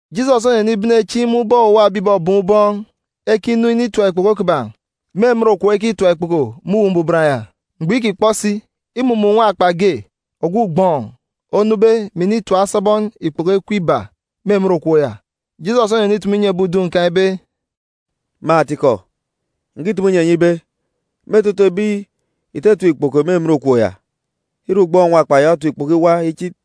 Jisọs onenibene chieen̄ imun̄ ubọk owuwa ebi ìbọbọọn̄ ubọọn̄ ekinu initap ikpoko kiban̄ me emen okop ekitap ikpoko me Uwu Mbuban ya. Mgbọ îkikpọ si, imumun̄ nwakpa ge, ogwu ugbọọn̄, onube, mè initap asabọn ikpoko ekwe ibaa me emen okop ya. Jisọs onenitumu inyi ebi udun̄ kan̄ ibe, “Me atikọ, ǹkitumu inyi enyi ibe, me etete otutuuk ebi ìtatap ikpoko me emen okop ya, îre ugbọọn̄ nwakpa ya otap ikpoko iwa ichit.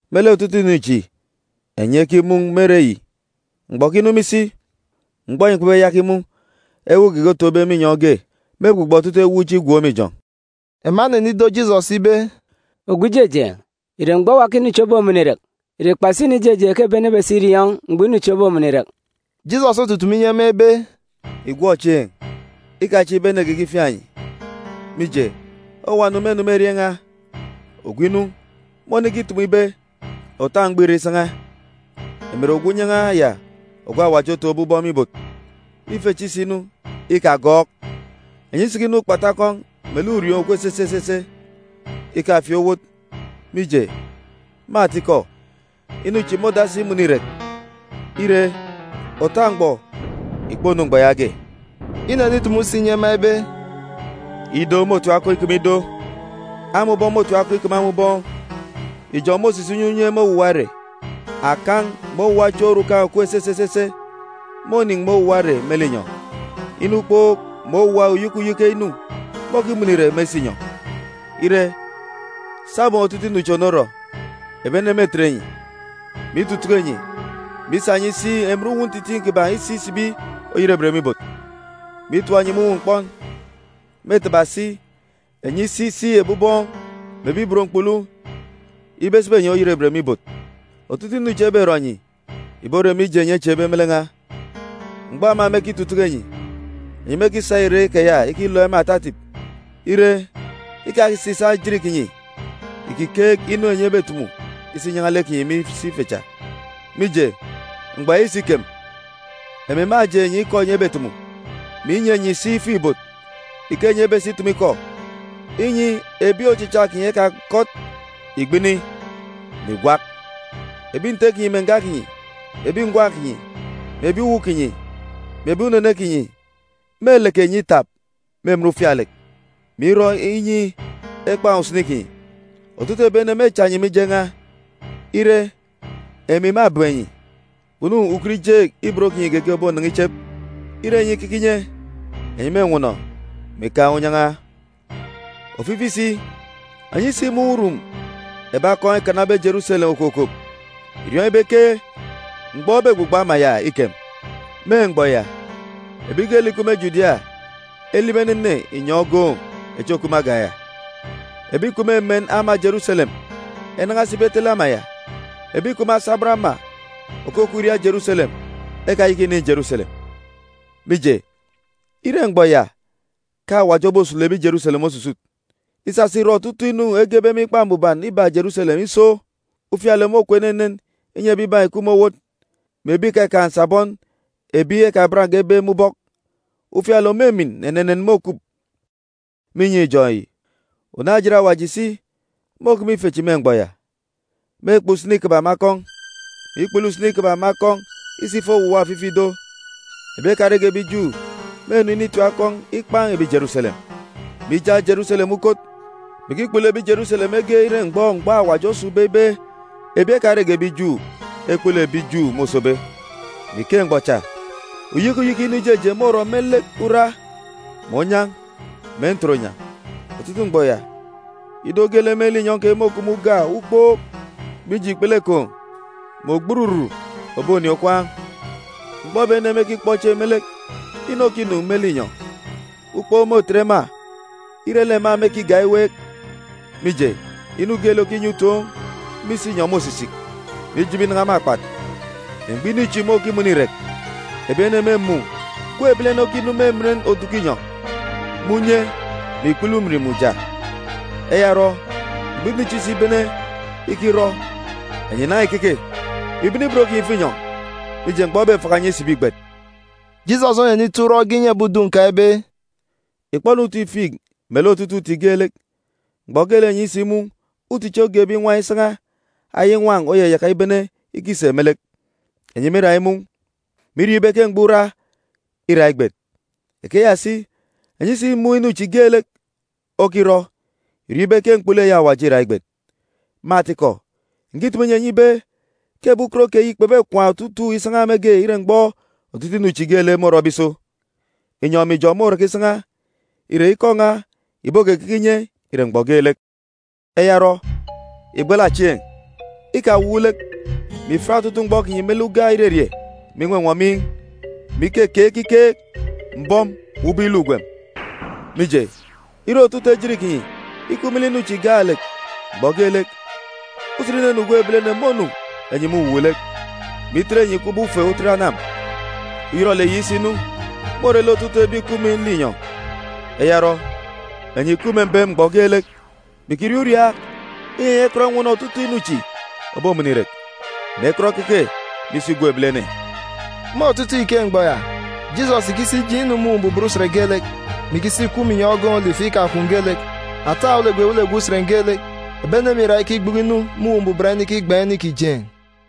“Me lek otutuuk inu chi enyi ekimun̄ me ere yi, mgbọ òkinu me isi, mgbọ enyi kpebeyaka imun̄ ewuuk geege otoon̄be me inyọn̄ ge. Mêgbugbọ otutuuk ewuuk chi igwook me ijọn̄.” Ema enenido Jisọs ibe, “Ogwu Ijejeen̄, ìre mgbọ owa ke inu chi obomọnọ irek? Ìre kpasi inu ijejeen̄ ke ebi ene ebesa iriọọn̄ mgbọ inu chi obomọnọ irek?” Jisọs otutumu inyi ema ibe, “Ìgwọk chieen̄, ikachieek ibe ene geege ifiaan̄ enyi. Mije, owuwa ene mênu me erieen̄ n̄a. Ogwu inu, mônikitumu ibe, ‘Òta mgbọ îre isan̄a! Emi nre ogwu unyan̄a ya ogwu Awaji otọkọbe aran̄ me ibot.’ Ife chi isinu, ikagọọk! Enyi isikinọ ukpatu akọn̄ melek ùrioon̄ òkup esese esese, ikafieek owot, mije, me atikọ, inu chi môdasi imọnọ irek. Ire, òta mgbọ ìkponu mgbọ yaage.” Inenitumu si inyi ema ibe, “Ido môtim akọn̄ ikeme ido, ama ubọọn̄ môtim akọn̄ ikeme ama ubọọn̄. Ijọn̄ môsisik unye unye me owuwa ere. Akan̄ mè owuwa chieen̄ orukan̄ òkup esese esese mônin̄ me owuwa ere me linyọn̄. Inu ukpook mè owuwa uyeke uyeke inu môkimọnọ irek me isinyọn̄. “Ire, sabum otutuuk inu chi ònorọ, ebi ene mêtet enyi, mè itutuku enyi, mè isa enyi isi emen uwu ntitiin̄ kiban̄ isi isibi oyerebet me ibot, mè itap enyi me uwu mkpọn. Mêtaba si enyi isi isi ebi ubọọn̄ mè ebi ibot mkpulu ibe esibi enyi oyerebet me ibot. Otutuuk inu chi eberọ enyi, ìbore mije enyi echieekbe me lek n̄a. Mgbọ ema mêkitutuku enyi, enyi mêkisa irek keya ikilook ema ata etip. Ire, ikasisaak ejit kinyi ìkikeek inu enyi ebetumu isa inyan̄a lek kinyi me isi ife cha. Mije, mgbọ ya isikem, emi mâjeen̄ enyi ikọ enyi ebetumu, mè inyi enyi si ifuk-ibot ike enyi ebesa itumu ikọ, inyi ebi ochicha kinyi ekakọt ìgbini, mè ìgwak. Ebi nte kinyi mè nga kinyi, mè ebi ngwan̄ kinyi, mè ebi uwu kinyi, mè ebi unene kinyi mêleke enyi itap me emen ufialek, mè irọ inyi ekpan̄ usini kinyi. Otutuuk ebi ene mêcha enyi mije n̄a. Ire, emi mâbem enyi. Kpunu ukut ijeek ibot kinyi geege òbonan̄a ichep. Ire enyi ikeke inye, enyi mênwọnọ, mè ikaan̄ unyan̄a. “Ofifi si, enyi isimun̄ urum ebi akọn̄ ekanabe Jeruselem okokop, ìriọọn̄ ibe ke mgbọ ebegbugbọ ama ya îkem. Me mgbọ ya, ebi geelek ìkup me Judia elibi enene inyọn̄ ogoon̄ echi òkup me agan̄ ya. Ebi ìkup me emen ama Jeruselem enan̄a esibi etele ama ya. Ebi ìkup me asabọn ama òkukup iriaak Jeruselem ekayaka ìnin̄ Jeruselem. Mije, îre mgbọ ya ke Awaji obosulu ebi Jeruselem osusut, isasa irọ otutuuk inu egebe me Ikpa Mbuban ibak Jeruselem iso. Ufialek môkup enenen inyi ebibaan̄ ìkup me owot, mè ebi ìkakaan̄ nsabọn ebi ekabange ebe me ubọk. Ufialek òmimin enenen môkup me inyọn̄ ijọn̄ yi. Unaan̄-ejit Awaji si môkeme ife chi me mgbọ ya. Mêkpan̄ usini kiban̄ me akọn̄, mè ikpulu usini kiban̄ me akọn̄ isa ifo owuwa ofifi ido. Ebi ekarege ebi Ju mênu initim akọn̄ ikpan̄ ebi Jeruselem, mè ijak Jeruselem me ukot, mè ikikpulu ebi Jeruselem mege ire mgbọ mgbọ Awaji osun̄be ibe ebi ekarege ebi Ju ekpulu ebi Ju môsobe. “Me ike mgbọ cha, uyeke uyeke inu ijejeen̄ môrọ me lek ura, mè onyan̄, mè ntoronyan̄. Otutuuk mgbọ ya, ido geelek me linyọn̄ keyi môkup me uga ukpook, mije ikpele ekoon̄ mè ogbururu òbonin̄ okwaan̄. Mgbọ ebi ene mêkikpọ chieen̄ me lek inu òkinu me linyọn̄, ukpook môtet ema ire lek ema mêkigak iweek, mije, inu geelek òkinyi utoon̄ me isinyọn̄ môsisik, mè ijibi inan̄a me akpat. Mgbọ inu chi môkimọnọ irek, ebi ene mêmun̄ Gwun̄ Ebilene okinu me emen oduku inyọn̄, me unye mè ikpele ujamgbugbo. Eya orọ, mgbọ inu chi isibene ikirọ, enyi ìnan̄a ìkeke, mè ìbene ibot kinyi ìfo inyọn̄, mije, mgbọ ebefaka enyi isibi îgbet.” Jisọs onenito urọk ge inyi ebi udun̄ kan̄ ibe, “Ìkpọ-nu uti figi melek otutuuk uti geelek. Mgbọ geelek enyi isimun̄ uti chi ogen̄be inwan̄ isan̄a, ayaya inwan̄ oyayaka ibene ikisek me lek, enyi mîra imun̄, mè iriọọn̄ ibe ke mgbọ ura îra igbet. Ikeya si, enyi isimun̄ inu chi geelek okirọ, ìriọọn̄ ibe ke mkpulu eyi Awaji îra igbet. “Me atikọ, ǹkitumu inyi enyi ibe ke ebi ukot keyi kpebekwaan̄ otutuuk isan̄a mege ire mgbọ otutuuk inu chi geelek môrọbe iso. Inyọn̄ mè ijọn̄ môraka isan̄a, ire, ikọ n̄a ìbokekeke inye ire mgbọ geelek. “Eya orọ, ìgbala chieen̄. Ikawuuk lek, mè ìfiat otutuuk mgbọ kinyi me lek uga irerie mè inwọnwọ miin̄, mè ikekeek ekiket mbọm mè ubọk iluk ugwem. Mije, ire otutuuk ejit kinyi ikup me lek inu chi gaalek mgbọ geelek, usen inunu Gwun̄ Ebilene mônu enyi me uwuuk-lek, mè itet enyi kubọk ufe otet anam. Uyọrọlek yi isinu, môre lek otutuuk ebi ìkup me linyọn̄. Eya orọ, enyi ìkup me mbem mgbọ geelek, mè ìkiriaak uriaak, inyi enyi ekọt enwọnọ otutuuk inu chi òbomọnọ irek, mè ekọt ekeke me isi Gwun̄ Ebilene.” Me otutuuk ike mgbọ ya, Jisọs ìkisi ijeen̄ inu me Uwu Mbuban usen geelek, mè ikisi ikup me inyọn̄ ogoon̄ Olifu ikakwun̄ geelek. Ata ewelegwe ewelegwe usen geelek, ebi ene mîra ikigbuku inu me Uwu Mbuban inikigban̄ inu ìkijeen̄.